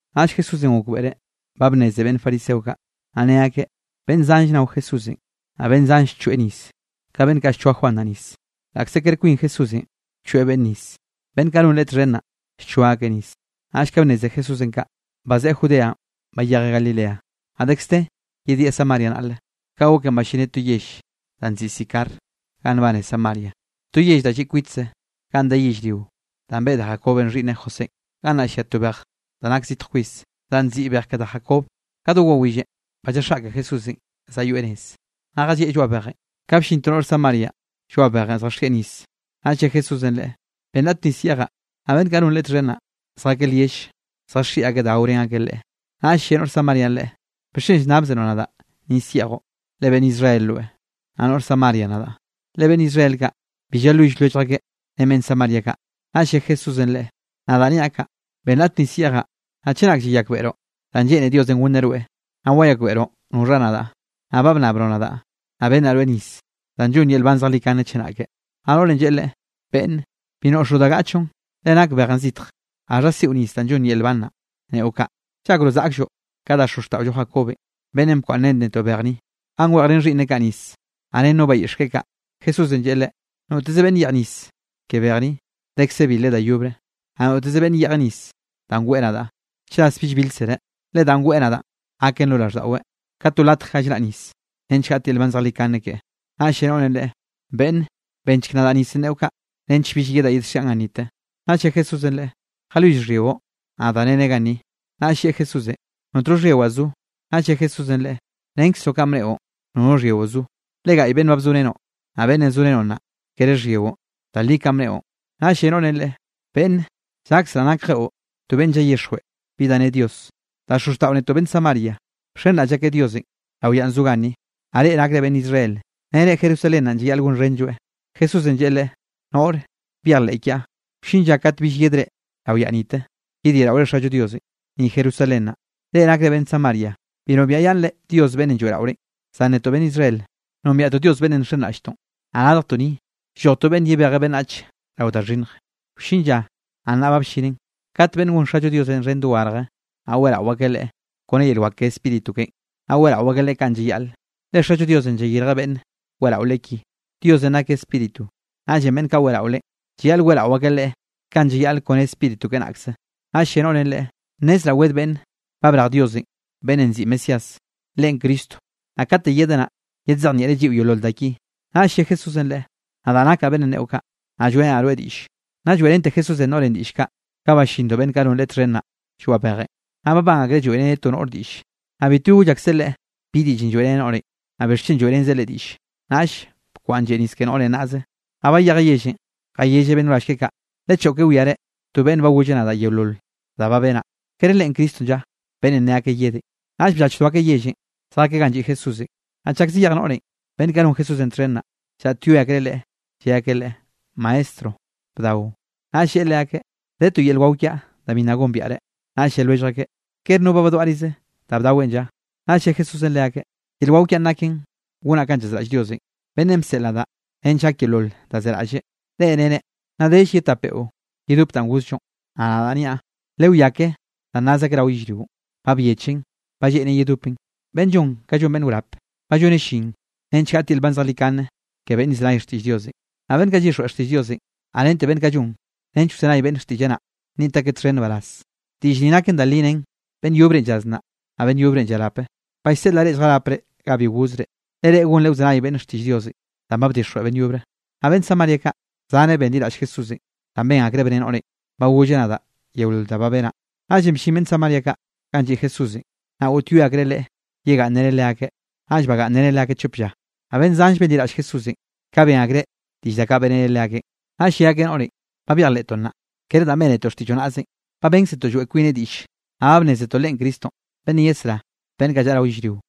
Naꞌll Jesúsenꞌ gokbeꞌreꞌ ba bnneze beꞌnn fariseo kaꞌ, naꞌ ne akeꞌ: beꞌnn zanll nao Jesúsenꞌ, naꞌ beꞌnn zanlle llchoeꞌ nis ka beꞌnn kaꞌ llchoa Juan naꞌ nis, (laꞌkze kere kwin Jesúsenꞌ bchoeꞌ beꞌnn nis, beꞌnn kaꞌ non Leꞌe txhen naꞌ, llchoaꞌ akeꞌ nis). Naꞌll ka bnneze Jesúsenꞌ kaꞌ, bazeꞌe Judeanꞌ bayejeꞌ Galilea. Naꞌ dekze de yedieꞌ Samaria naꞌle. Ka goken ballineꞌ to yell da nziꞌi Sicar ga nbane Samaria, to yell da lliꞌ kwitze ganꞌ de yellrio danꞌ beꞌe da Jacobenꞌ xhiꞌnneꞌ Josénꞌ. Gannaꞌ llia to bej da nake zitj kwis, danꞌ nziꞌi Bej ke da Jacob. Ka do wawillenꞌ ba lljaxaꞌke Jesúsenꞌ zayoeꞌ nez, naꞌ jallieꞌ lloaꞌ bejenꞌ. Ka bllin to noꞌr Samarianꞌ lloaꞌ bejenꞌ zjaxieꞌ nis. Naꞌll lle Jesúsenꞌ leꞌe: —Benn raꞌt nis yeꞌjaꞌ. Naꞌ beꞌnn kaꞌ non Leꞌe txhen naꞌ, zjakeꞌ lyell zjaxiꞌi akeꞌ da gaorén akeꞌ Leꞌe. Naꞌll lle noꞌr Samarianꞌ Leꞌe: —¿Bixchen llnnabzeroꞌ nadaꞌ nis yeꞌjoꞌ, le beꞌnn Israel rweꞌ, naꞌ noꞌr Samaria nadaꞌ? (Le beꞌnn Israel kaꞌ, bi llalwill lwellj akeꞌ ren beꞌnn Samaria kaꞌ.) Naꞌll lle Jesúsenꞌ Leꞌe: —Nadaꞌ niaꞌ kaꞌ: “Benn raꞌt nis yeꞌjaꞌ”, naꞌ chenak llayakbeꞌroꞌ danꞌ lleꞌne Diosenꞌ gonneꞌ rweꞌ, naꞌ wayakbeꞌroꞌ noxha nadaꞌ, naꞌ ba bnnabroꞌ nadaꞌ, naꞌ bennaꞌ rweꞌ nis danꞌ llonn yel nban zejlikane chenake. Naꞌ noꞌrenꞌ lleꞌe Leꞌe: —Beꞌnne, bi noꞌxoꞌ da gaꞌchoꞌn le nak bejenꞌ zitj. ¿Gaxha siꞌo nis danꞌ llonn yel nban naꞌ, neꞌo kaꞌ? ¿Llakroꞌ zaꞌklloꞌ ka da xozxtaꞌollo Jacobenꞌ, beꞌnnenꞌ bkwaꞌnnrén netoꞌ bej ni, ganꞌ weꞌjrén xhiꞌnneꞌ kaꞌ nis, naꞌ ren no bayiꞌx keꞌe kaꞌ? Jesúsenꞌ lleꞌe leꞌe: —Noteze beꞌnne yeꞌj nis ke bej ni, dekze bilreꞌ da yobre. Naꞌ noteze beꞌnne yeꞌjeꞌ nis danꞌ weꞌe nadaꞌ, chras bill bilkzereꞌ, le danꞌ weꞌe nadaꞌn gaken lo raꞌlldaꞌweꞌ ka to latje ga llraꞌ nis, nench gaꞌt yel nban zejlikane keꞌe. Naꞌll lle noꞌrenꞌ Leꞌe: —Beꞌnne, bennchek nadaꞌ nisenꞌ neꞌo kaꞌ nench bill yedaꞌ yedxiaꞌn gannite. Naꞌll lle Jesúsenꞌ leꞌe: —Jalwill xhyiꞌo, naꞌ dareneꞌ ganni. Naꞌll lleꞌe Jesúsenꞌ: —Notno xhyiwaꞌ zo. Naꞌll lle Jesúsenꞌ leꞌe: —Rennkzroꞌ kanꞌ bneꞌon nono xhyiꞌo zo, le gaꞌy beꞌnn ba bzorenoꞌ, naꞌ beꞌnnenꞌ zorenoꞌ nnaꞌ, kere xhyiꞌon. Da li kanꞌ bneꞌon. Naꞌll lle noꞌrenꞌ Leꞌe: —Beꞌnne, llakzraꞌ nakjeꞌo to beꞌnne llayixjweꞌ bi da ne Dios. Da xozxtaꞌo netoꞌ beꞌnne Samaria, bxenraꞌll akeꞌ Diosenꞌ rao yaꞌn zo ganni, naꞌ reꞌ nakre beꞌnn Israel, nere Jerusalén naꞌn llayaꞌl gonxhenlloeꞌ. Jesúsenꞌ lleꞌe leꞌe: —Noꞌre, byejleꞌ kiaꞌ, wllin lla kat bill yedre rao yaꞌ nite, yedyeꞌraore Xallo Diosenꞌ, ni Jerusalén naꞌ. Reꞌ nakre beꞌnn Samaria bi nombiaꞌyaꞌnnre Dios beꞌnnenꞌ lloeꞌraorenꞌ. Zan netoꞌ beꞌnn Israel, nombiaꞌtoꞌ Dios beꞌnnenꞌ nxenraꞌlltoꞌn, naꞌ radjtoꞌ ni lloj to beꞌnn yebejeꞌ beꞌnnach rao da xhinnj. Wllin lla, naꞌ nnaꞌ ba bllinen, kat beꞌnn gon Xallo Diosenꞌ xhen dogarje, naꞌ weꞌrao akeꞌ Leꞌe kone yel wak ke Spíritu keꞌen, naꞌ weꞌrao akeꞌ Leꞌe kanꞌ llayaꞌle, le Xallo Diosenꞌ llayirjeꞌ beꞌnne weꞌrao Leꞌe ki. Diosenꞌ nakeꞌ Spíritu, naꞌllenꞌ beꞌnn kaꞌ weꞌrao Leꞌen, llayaꞌl weꞌrao akeꞌ Leꞌe kanꞌ llayaꞌle kone Spíritu keꞌe naꞌkze. Naꞌll lle noꞌrenꞌ Leꞌe: —Nnezraꞌ wed beꞌnn ba brej Diosenꞌ beꞌnnenꞌ nziꞌi Mesías, Leꞌen Cristo, naꞌ kate yedeꞌ naꞌ, yedzejnieꞌreꞌ lliꞌo yeolol da ki. Naꞌll lle Jesúsenꞌ leꞌe: —Nadaꞌ nakaꞌ beꞌnnenꞌ neꞌo kaꞌ, naꞌ lloeꞌrenaꞌ rweꞌ diꞌlle. Nna lloeꞌrente Jesúsenꞌ noꞌrenꞌ diꞌll kaꞌ, ka ballindo beꞌnn kaꞌ non Leꞌe txhen naꞌ lloaꞌ bejenꞌ. Naꞌ babán akreꞌ lloeꞌreneꞌ to noꞌre diꞌlle, naꞌ bitbi goll akseꞌ Leꞌe bi diꞌllenꞌ lloeꞌreneꞌ noꞌrenꞌ, naꞌ bixchen lloeꞌrenzeꞌ leꞌe diꞌlle. Naꞌll bkwaꞌnn lleꞌ nis ke noꞌrenꞌ naꞌze, naꞌ bayejeꞌ yellenꞌ jayelleꞌ beꞌnn wrall keꞌe kaꞌ: —Lechoꞌke wiare to beꞌnn ba golleꞌ nadaꞌ yeolol da ba benaꞌ. ¿Kere Leꞌen Cristonꞌ lla, beꞌnnenꞌ ne akeꞌ yedenꞌ? Naꞌll bllachdo akeꞌ yellenꞌ zjakeꞌ ganꞌ lliꞌ Jesúsenꞌ. Naꞌ chak zayej noꞌrenꞌ, beꞌnn kaꞌ non Jesúsenꞌ txhen naꞌ, llaꞌtyoe akreꞌ Leꞌe, lle akeꞌ Leꞌe: —Maestro, bdao. Naꞌll lleꞌe leakeꞌ: —De to yel wao kiaꞌ da bi nna gombiaꞌre. Naꞌll lle lwellj akeꞌ: —¿Kere no ba badwaꞌrize da bdaweꞌn lla? Naꞌll lle Jesúsenꞌ leakeꞌ: —Yel wao kiaꞌn naken gonaꞌ kanꞌ llazraꞌll Diosenꞌ, beꞌnnenꞌ bseꞌl nadaꞌ nench gak yeolol da zeraꞌlleꞌ. Reꞌ nere: “Nna dell ye tap beꞌo yedop danꞌ gozllonꞌ.” Naꞌ nadaꞌ niaꞌ, lewiá ke danꞌ naz akeꞌ rao yellrio, ba byechen ba lleꞌnen yedopen. Beꞌnn llon ka beꞌnn llon wrap, ba lloneꞌ llin nench gaꞌt yel nban zejlikane ke beꞌnn llzenay xtiꞌll Diosenꞌ. Naꞌ beꞌnn kaꞌ llyixjweꞌ xtiꞌll Diosenꞌ, naꞌ rente beꞌnn kaꞌ llon nench wzenay beꞌnn xtiꞌlleꞌ naꞌ, nniꞌt akeꞌ txhen nbaraz. Diꞌll ni naken da li nen: “Beꞌnn yobre llaz naꞌ, naꞌ beꞌnn yobre llarape.” Ba llseꞌlaꞌ reꞌ lljarapre ganꞌ bi gozre, le reꞌ gonre wzenay beꞌnne xtiꞌll Diosenꞌ danꞌ ba bdixjweꞌ beꞌnn yobre. Naꞌ beꞌnn Samaria kaꞌ, zaneꞌ benliraꞌll Jesúsenꞌ danꞌ ben akreꞌ bne noꞌrenꞌ: “Ba golleꞌ nadaꞌ yeolol da ba benaꞌ.” Naꞌllenꞌ bllin beꞌnn Samaria kaꞌ ganꞌ lliꞌ Jesúsenꞌ, naꞌ goꞌtyoe akreꞌ Leꞌe yegaꞌnnreneꞌ leakeꞌ, naꞌll bagaꞌnnreneꞌ leakeꞌ chop lla. Naꞌ beꞌnn zanlle benliraꞌll Jesúsenꞌ ka ben akreꞌ diꞌll da kaꞌ beꞌreneꞌ leakeꞌn. Naꞌll lle akeꞌ noꞌrenꞌ: —Ba byejleꞌtoꞌ naꞌ, kere danꞌ bénetoꞌ xtiꞌlloꞌ naꞌzenꞌ, ba bénkzetoꞌ lloeꞌ kwineꞌ diꞌlle, naꞌ ba bnnézetoꞌ Leꞌen Cristonꞌ beꞌnnenꞌ yesrá beꞌnn kaꞌ llaꞌa yellrio.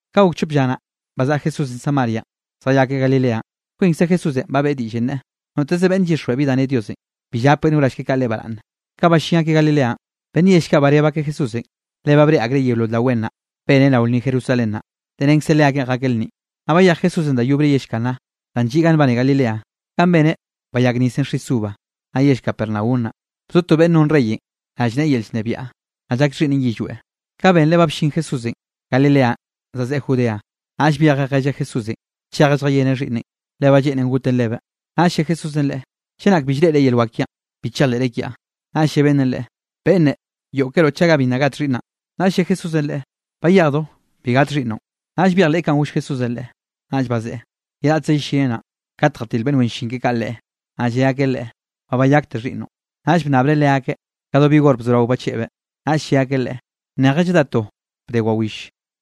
Ka gok chop lla naꞌ, bazaꞌa Jesúsenꞌ Samarianꞌ zjayakeꞌ Galileanꞌ. Kwinkze Jesúsenꞌ ba beꞌe diꞌll neꞌe, noteze beꞌnne llyixjweꞌ bi da ne Diosenꞌ, bi llap beꞌnn wrall keꞌe kaꞌ leꞌe baraꞌnne. Ka ballín akeꞌ Galileanꞌ, beꞌnn yell kaꞌ bareb akeꞌ Jesúsenꞌ, le ba breꞌe akreꞌ yeolol da wen naꞌ beneꞌ rao lnni Jerusalén naꞌ, le renkze leakeꞌn jakeꞌ lnninꞌ. Naꞌ bayej Jesúsenꞌ da yobre yell Caná, danꞌ lliꞌ ganꞌ nbane Galileanꞌ ganꞌ beneꞌ bayak nisenꞌ xis uva, naꞌ yell Capernaum naꞌ, bzo to beꞌnn non reyenꞌ rallneꞌe yel llnebiaꞌ, naꞌ llak xhiꞌnneꞌn yillweꞌ. Ka benreꞌ ba bllin Jesúsenꞌ Galileanꞌ zazeꞌe Judea, naꞌll byejeꞌ jelleꞌ Jesúsenꞌ chejeꞌ lljayeneꞌ xhiꞌnneꞌn, le ba lleꞌnen goten lebeꞌ. Naꞌll lle Jesúsenꞌ leꞌe: —Chenak bi llreꞌre yel wak kiaꞌn, bi chejleꞌre kiaꞌ. Naꞌll lle beꞌnnenꞌ Leꞌe: —Beꞌnne, yoꞌkeroꞌ chaga bi nna gat xhiꞌnnaꞌn. Naꞌll lle Jesúsenꞌ leꞌe: —Bayejdo, bi gat xhiꞌnnoꞌn. Naꞌll byejleꞌ kanꞌ goll Jesúsenꞌ leꞌe, naꞌll bazeꞌe. Ye raꞌtz yellineꞌ naꞌn, kat jatil beꞌnn wen llin keꞌe kaꞌ leꞌe, naꞌll lle akeꞌ leꞌe: —Ba bayakte xhiꞌnnoꞌn. Naꞌll bnnabreꞌ leakeꞌ ka do bi hor bzorao bacheꞌbeꞌ, naꞌll lle akeꞌ leꞌe: —Neje lladá to bde wawill,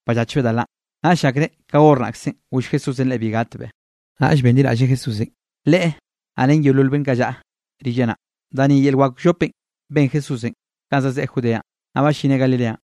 ballachbeꞌ da lanꞌ. Naꞌll llakreꞌ ka hor naꞌkzenꞌ goll Jesúsenꞌ leꞌe bi gatbeꞌ. Naꞌll benliraꞌlleꞌ Jesúsenꞌ, leꞌe naꞌ, ren yeolol beꞌnn kaꞌ llaꞌa rilleꞌ naꞌ. Da ni yel wak wllopenꞌ ben Jesúsenꞌ kanꞌ zazeꞌe Judeanꞌ, naꞌ ballineꞌ Galileanꞌ.